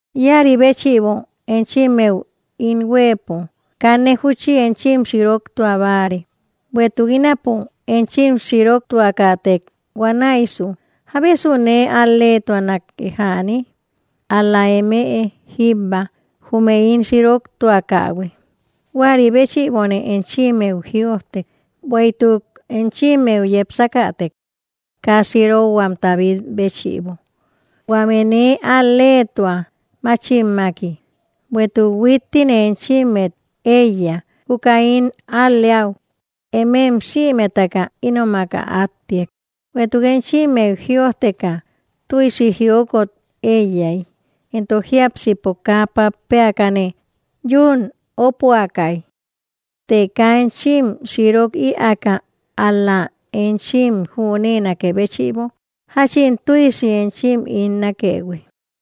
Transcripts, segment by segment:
Ïaribéchïbo enchimmeu ín huëpo kanne júchi enchim siroktua báare. Bueïtuk ínapo enchim siroktuakätek, huanäisu, ¿jábesu nee al-leetuanake jäni? Al‑la emëe jíbba, jume ín siroktuakähui. Juäri béchïbone enchimmeu jïojtek, bueïtuk enchimeu yepsakätek kaa sirokhuamta bit béchïbo, huäme nee al‑letua máchimmaki. Bueïtuk huittine enchimmet eiya juka ín al-leäu, emem sïmetaka ínomak ä attiak. Bueïtuk enchimmeu jïojtekä, tüisi jiokot eiyay entok jiápsipo kaa pappeakane yún opoakay; të kaa enchim sirok ïaka, ál‑la enchim jünenakë béchïbo jachin tüisi enchim ín nakëhui.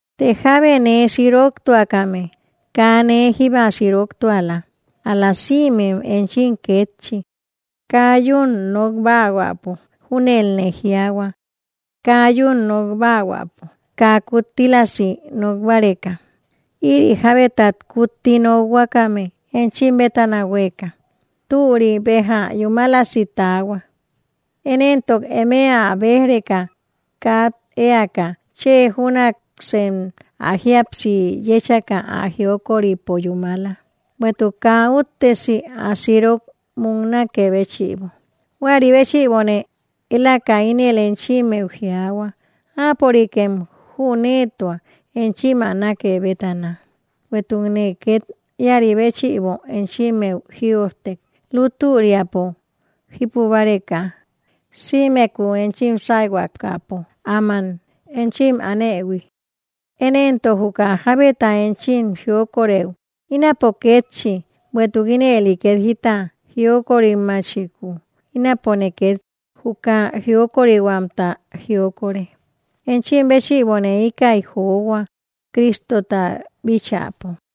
Të jábe nee siroktuakame, kaa nee jíba siroktuala, ál‑la sïmem enchim kétchi, kaa yún nokbáahuäpo, júnelne jiaahua, “kaa yún nokbáahuäpo”, kaa kuttílasi nok báreka. Ïri jabetat kutti nokhuakame enchim bétana hueeka, türi beja yúmalasi taahua. Én entok emëe ä bej‑reka kat eaka, chë júnaksanem ä jíapsi yechaka ä jioköripo yúmala, bueïtuk kaa uttesi ä sirok múknakë béchïbo. Juäri béchïbone eláka ínel enchimmeu jiaahua áapörikem jünetua enchim ä nake bétana. Bueïtukne ket ïari béchïbo enchimmeu jïojtek, lutüriapo jípubareka sïmeku enchim sayhuakapo áman enchim anëhui. Én entok, juka jábeta enchim jioköreu, ínapo kétchi. Bueïtuk ínëli ket jita jiokörimachiku, ínapone ket juka jiokorihuamta jioköre, enchim béchïbone íkäi johua, Cristota bíchäpo,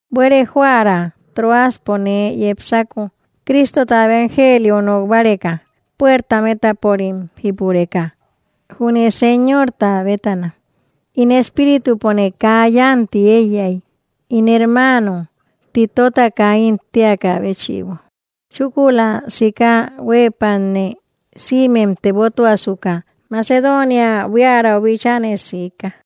Buere joära Troaspo nee yepsako Cristota evangelio nok báreka, puertam étaporim jípureka junne Señorta bétana. In espíritupone kaa yanti eiyay ín hermano Titota kaa ín teaka béchïbo. Chúkula, sika huëpatne sïmem tebotuasuka Macedonia buiärau bíchaane siika.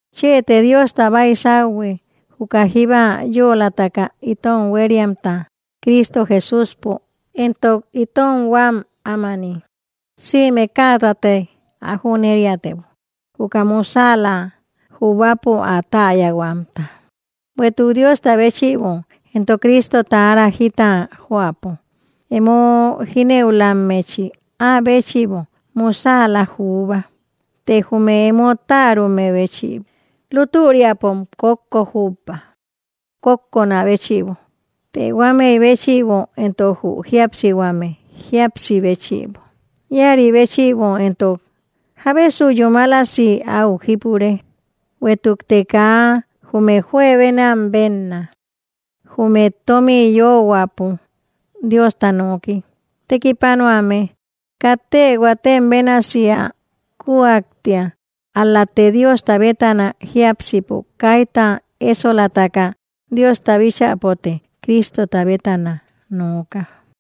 Chëte Diosta baisáuhue, juka jíba yölataka itom hueriamta Cristo Jesúspo entok itom huam ámani sïme kätanate ä jüneriatebo, juka musäla jubäpo ä täyahuamta. Bueïtuk Diosta béchïbo entok Cristota ára jita joäpo, emo jinëulammechi áa béchïbo musäla juuba, të jume emo tärume béchïbo. Lüturiapom kókko jubba, kokköna béchïbo; të huamey béchïbo entok jü jíapsihuame jíapsi béchïbo. Iäri béchïbo entok, ¿jábesu yúmalasi au jipure? Bueïtukte kaa jume juebenam benna jume tomi yöhuäpo Diosta noki tekipanuame, katte huatem bénasi ä kujaktia, ál‑late Diosta bétana jiápsipo kayta esolataka; Diosta bíchäpote Cristota bétana nooka.